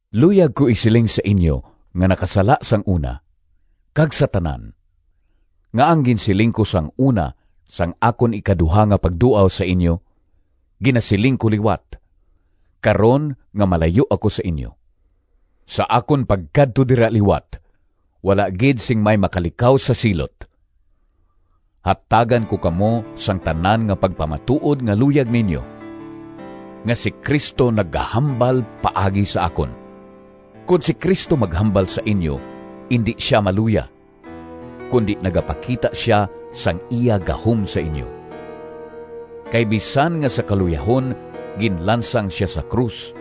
Luyag ko isiling sa inyo nga nakasala sang una, kag sa tanan, nga ang ginsiling ko sang una sang akon ikaduha nga pagduaw sa inyo, ginasiling ko liwat, karon nga malayo ako sa inyo: sa akon pagkadto dira liwat wala gid sing may makalikaw sa silot. Hatagan ko kamo sang tanan nga pagpamatuod nga luyag ninyo, nga si Cristo nagahambal paagi sa akon. Kon si Cristo maghambal sa inyo indi sia maluya, kundi nagapakita sia sang iya gahom sa inyo. Kay bisan nga sa kaluyahon ginlansang sia sa krus,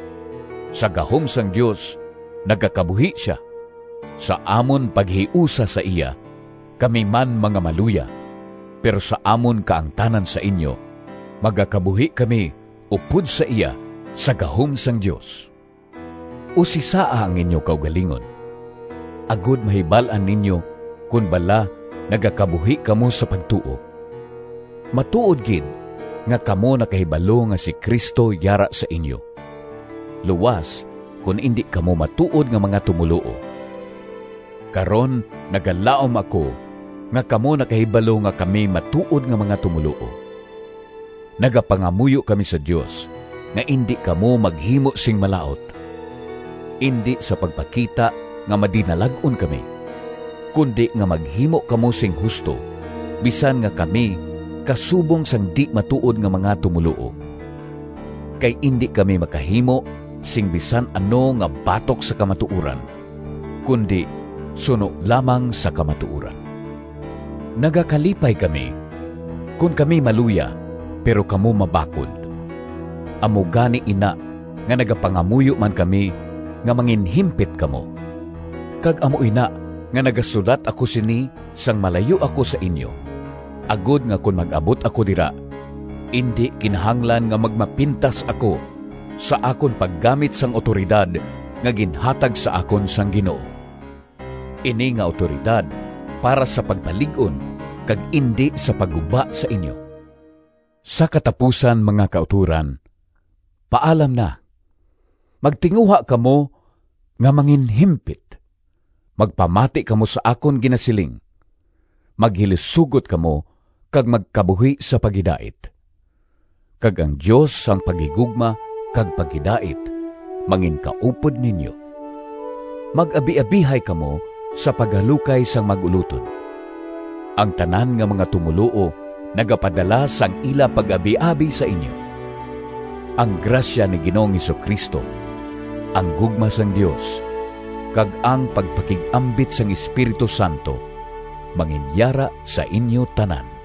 sa gahom sang Dios nagakabuhi sia. Sa amon paghiusa sa iya kami man mga maluya, pero sa amon kaangtanan sa inyo, magakabuhi kami upod sa iya sa gahom sang Dios. Usisaa ang inyo kaugalingon, agod mahibal-an ninyo kon bala nagakabuhi kamo sa pagtuo. Matuod gid nga kamo nakahibalo nga si Cristo yara sa inyo, luas kon indi kamo matuod nga mga tumoluo. Karon nagalaom ako nga kamo nakahibalo nga kami matuod nga mga tumoluo. Nagapangamuyo kami sa Dios nga indi kamo maghimo sing malaut—indi sa pagpakita nga madinalag-on kami, kundi nga maghimo kamo sing husto, bisan nga kami kasubong sang di-matuod nga mga tumoluo. Kay indi kami makahimo sing bisan ano nga batok sa kamatuoran, kundi suno lamang sa kamatuoran. Nagakalipay kami kon kami maluya pero kamo mabakod. Amo gani ina nga nagapangamuyo man kami nga manginhimpit kamo. Kag amo ina nga nagasulat ako sini sang malayo ako sa inyo, agod nga kon mag-abot ako dira indi kinahanglan nga magmapintas ako sa akon paggamit sang awtoridad nga ginhatag sa akon sang Ginoo. Ini nga awtoridad para sa pagpalig-on kag indi sa pagguba sa inyo. Sa katapusan, mga kautoran, paalam na! Magtinguha kamo nga manginhimpit. Magpamati kamo sa akon ginasiling. Maghilisugot kamo kag magkabuhi sa paghidait. Kag ang Dios sang paghigugma kag paghidait manginkaupod ninyo. Mag-abiabihay kamo sa paghalukay sang mag-ulotod. Ang tanan nga mga tumoluo nagapadala sang ila pag-abiabi sa inyo. Ang grasya ni Ginoong Jesu-Cristo, ang gugma sang Dios kag ang pagpakig-ambit sang Espiritu Santo manginyara sa inyo tanan.